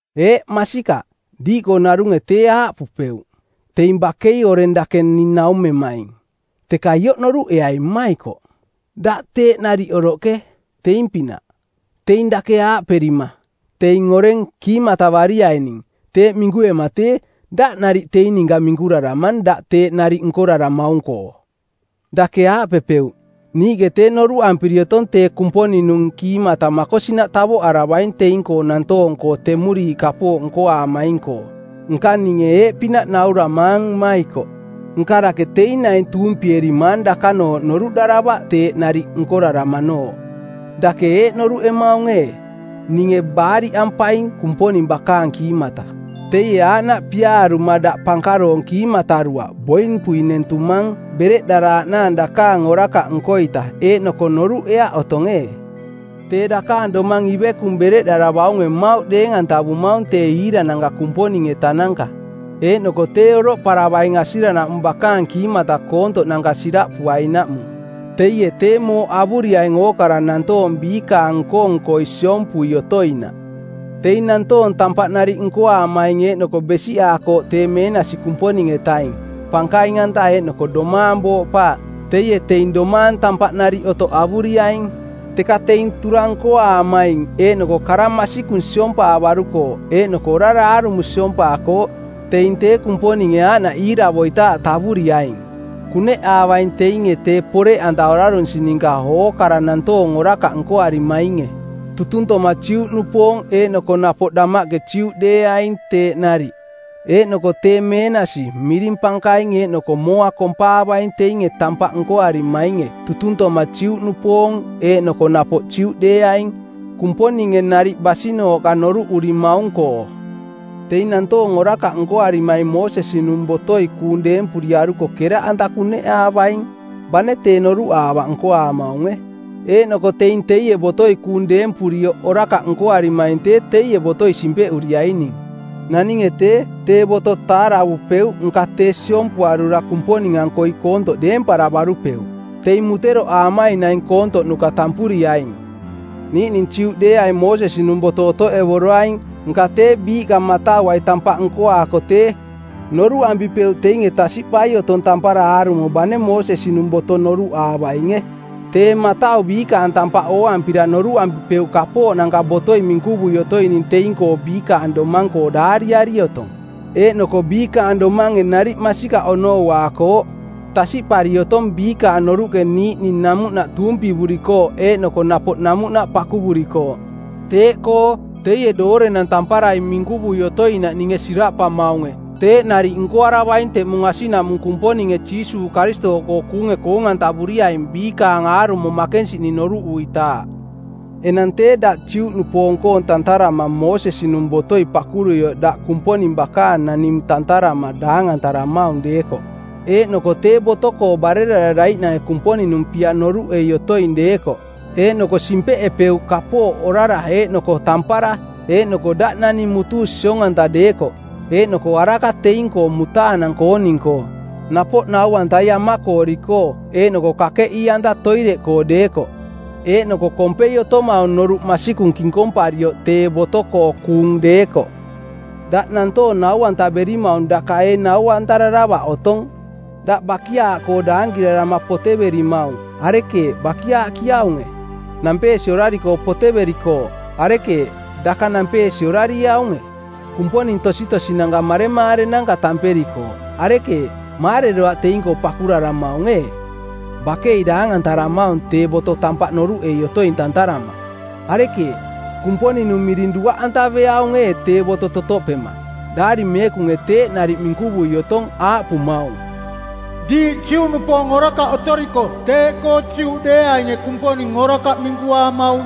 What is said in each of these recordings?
Eeꞌ masikaꞌ, diiꞌkoo narunge tee aaꞌpupeuꞌ: Teing bakei oreng dake ning naumemaing. Teka ioꞌ noruꞌeai mmaikoꞌ: Daꞌ teeꞌ nariꞌ oroꞌke, teing-pinaꞌ. Teing dake aaꞌperima: Teing oreng, kiimatavariaining, teeꞌ minkuema tee, daꞌ nariꞌ teing ninka minkuraramang daꞌ teeꞌ nariꞌ nkoraramaung-koo. Dake aaꞌpepeuꞌ: Niiꞌke tee noruꞌampiri otong tee Kumponing-nung kiimata makosinaꞌ tavoꞌaravaing teing-koo nantoong-koo temuriiꞌ kapooꞌ nkoaamaing-koo. Nka ninge eeꞌpinaꞌ nauramaang mmaikoꞌ: Nka dake teing naing tuumpierimaang dakanooꞌ noruꞌdaravaꞌ teeꞌ nariꞌ nkoraramanooꞌ? Dake eeꞌ noruꞌemaung ee: “Ninge baariꞌampaing Kumponing bakaang kiimata.”? Teie aaꞌnaꞌ piaaruma daꞌ pankaroong kiimataruaꞌ, boimpui nentumang bereꞌdaraaꞌnaang dakaang orakaꞌ nko-ita, eeꞌnoko noruꞌeaꞌ otong ee? Tee dakaang domang ivekung bereꞌdaravaunge mmauꞌ deeng-antavemaung tee iirananka Kumponing-etananka, eeꞌnoko tee oroꞌparavaing asiranaꞌmung bakaang kiimata koontoꞌnanka siraꞌpuainaꞌmung. Teie tee mooꞌ avuriaing ookara nantoong biikaang nko-nkoi siompui otoinaꞌ. Teing nantoong tampaꞌ nariꞌ nkoaamaing eeꞌnoko besiꞌaakooꞌ tee meenasi Kumponing-etaing, pankaing-anta, eeꞌnoko domaang booꞌpaaꞌ, teie teing domaang tampaꞌ nariꞌ otoꞌ avuriaing. Teka teing turang nkoaamaing eeꞌnoko kara masikung siompaavarukooꞌ eeꞌnoko orara aarumo siompaakooꞌ teing tee Kumponinge aaꞌnaꞌ iiravoitaaꞌ tavuriaing. Kuneꞌaavaing teinge tee poreꞌanta orarunsi ninka ookara nantoong orakaꞌ nkoarimainge, tutuntoma Juꞌnupoong eeꞌnoko napoꞌ damaꞌke Juꞌdeeaing teeꞌ nariꞌ. Eeꞌnoko tee meenasi, miring pankaing eeꞌnoko mooa kompaavaing teinge tampaꞌ nkoarimainge tutuntoma Juꞌnupoong eeꞌnoko napoꞌ Juꞌdeeaing, Kumponinge nariꞌ basinooꞌka noruꞌurimaung-koo. Teing nantoong orakaꞌ nkoarimaing Moosesi-nung botoi kuung deempuriaruko keraꞌanta kuneꞌaavaing, bane tee noruꞌaavaꞌ nkoaamaunge. Eeꞌnoko teing teie botoi kuung deempurioꞌ orakaꞌ nkoarimaing tee teie botoi simpeꞌuriaining. Naninge tee, tee boto taaravupeuꞌ nka tee siompuarura Kumponing-ankoi koontoꞌ deemparavarupeuꞌ. Teing muteroꞌaamaing naing koontoꞌnuka tampuriaing. Niiꞌning Juꞌdeeaing Moosesi-nung boto otoꞌevoroaing, nka tee biiꞌka matauai tampaꞌ nkoaako tee, noruꞌampipeuꞌ teinge tasiꞌpai otong tampara aarumo bane Moosesi-nung boto noruꞌaavainge. Tee matau biikaang tampaꞌ ooampira noruꞌampipeuꞌ kapooꞌnanka botoi minkuvui otoining teing-koo biikaang domang-koo daariari otong. Eeꞌnoko biikaang domange nariꞌ masikaꞌ onouaakooꞌ. Tasiꞌpari otong biikaang noruꞌke niiꞌning namuꞌnaꞌ tuumpivurikooꞌ eeꞌnoko napoꞌ namuꞌnaꞌ pakuvurikooꞌ. Teeꞌkoo, teie doorenang tamparai minkuvui otoinaꞌ ninge siraꞌpamaunge, teeꞌ nariꞌ nkoaravaing teꞌmung asiꞌnaꞌmung Kumponinge Jiisuuꞌ Karistooꞌkoo kuunge koong-antavuriaing biikaang aarumo makensiꞌning noruꞌuitaaꞌ. Enang tee daꞌ Juꞌnupoong-koong tantarama Moosesi-nung botoi pakuruioꞌ daꞌ Kumponing bakaang naning tantarama daangantaramaung deekoꞌ, eeꞌnoko tee boto-koo barerararaiꞌnange Kumponing-nung pia noruꞌei otoing deekoꞌ, eeꞌnoko simpeꞌepeuꞌ kapooꞌ orara eeꞌnoko tampara, eeꞌnoko daꞌ naning mutuu siong-anta deekoꞌ, eeꞌnoko araka teing-koo mutaanang-kooning-koo, napoꞌ nau-antai amakoori-koo, eeꞌnoko kakeꞌii-anta toireꞌkoo deekoꞌ, eeꞌnoko kompei otomaung noruꞌ masikung kinkomparioꞌ tee boto-koo kuung deekoꞌ, daꞌ nantoong nau-antaverimaung daka ee nau-antararavaꞌ otong? Daꞌ bakiaaꞌkoo daankirarama poteverimaung, arekeeꞌ, bakiaaꞌkiaunge? Nampeesi orari-koo poteverikooꞌ. Arekeeꞌ, daka nampeesi orarieaunge? Kumponing tositosinanka maremaarenanka tamperikooꞌ. Arekeeꞌ, maareroaꞌ teing-koo pakuraramaung ee? Bakei daangantaramaung tee boto tampaꞌ noruꞌei otoing tantarama. Arekeeꞌ, Kumponing-nung miring duaꞌantaveaung ee tee boto totoꞌpema? Daari Meekunge teeꞌ nariꞌ minkuvui otong, aaꞌpumaung, “Diiꞌ Juꞌnupoong orakaꞌ otoriko teeꞌkoo Juꞌdeeainge Kumponing orakaꞌ minkuaamaung.”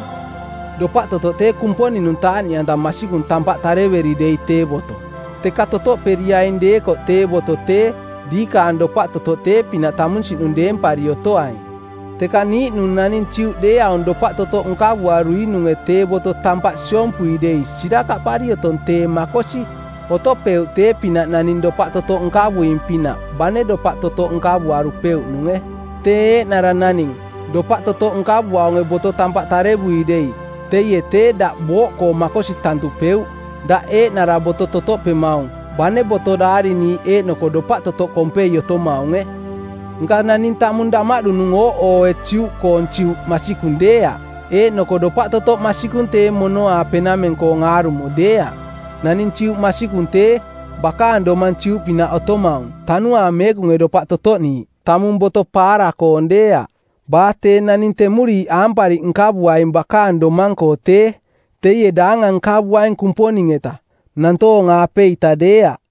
Dopaꞌ totoꞌ tee Kumponing-nung taaꞌniꞌanta masikung tampaꞌ taaraveri dei tee boto. Teka totoꞌperiaing deekoꞌ tee boto tee, diikaang dopaꞌ totoꞌ tee-pinaꞌ tamunsiꞌnung deempari otoaing. Teka niiꞌnung naning Juꞌdeeaung dopaꞌ totoꞌ nkavuaruinunge tee boto tampaꞌ siompui dei sirakaꞌpari otong tee makosi, otopeuꞌ tee-pinaꞌ naning dopaꞌ totoꞌ nkavuing-pinaꞌ, bane dopaꞌ totoꞌ nkavuarupeuꞌnunge. Tee eeꞌnara naning, dopaꞌ totoꞌ nkavuaunge boto tampaꞌ tarevui dei, teie tee daꞌ booꞌkoo makosi tantupeuꞌ, daꞌ eeꞌnara boto totoꞌpemaung, bane boto daariniiꞌ eeꞌnoko dopaꞌ totoꞌ kompei otomaunge. Nka naning tamung damaꞌdunung ooꞌooe Juꞌkoong Juꞌ masikung deeaꞌ, eeꞌnoko dopaꞌ totoꞌ masikung tee mono-aapenameng-koong aarumo deeaꞌ. Naning Juꞌ masikung tee, bakaang domang Juꞌpinaꞌ otomaung, Tanuaang Meekunge dopaꞌ totoꞌniiꞌ, tamung boto paara-koong deeaꞌ. Baa tee naning temuriiꞌ aampariꞌ nkavuaing bakaang domang-koo tee, teie daangang nkavuaing Kumponing-eta, nantoong-aapeita deeaꞌ.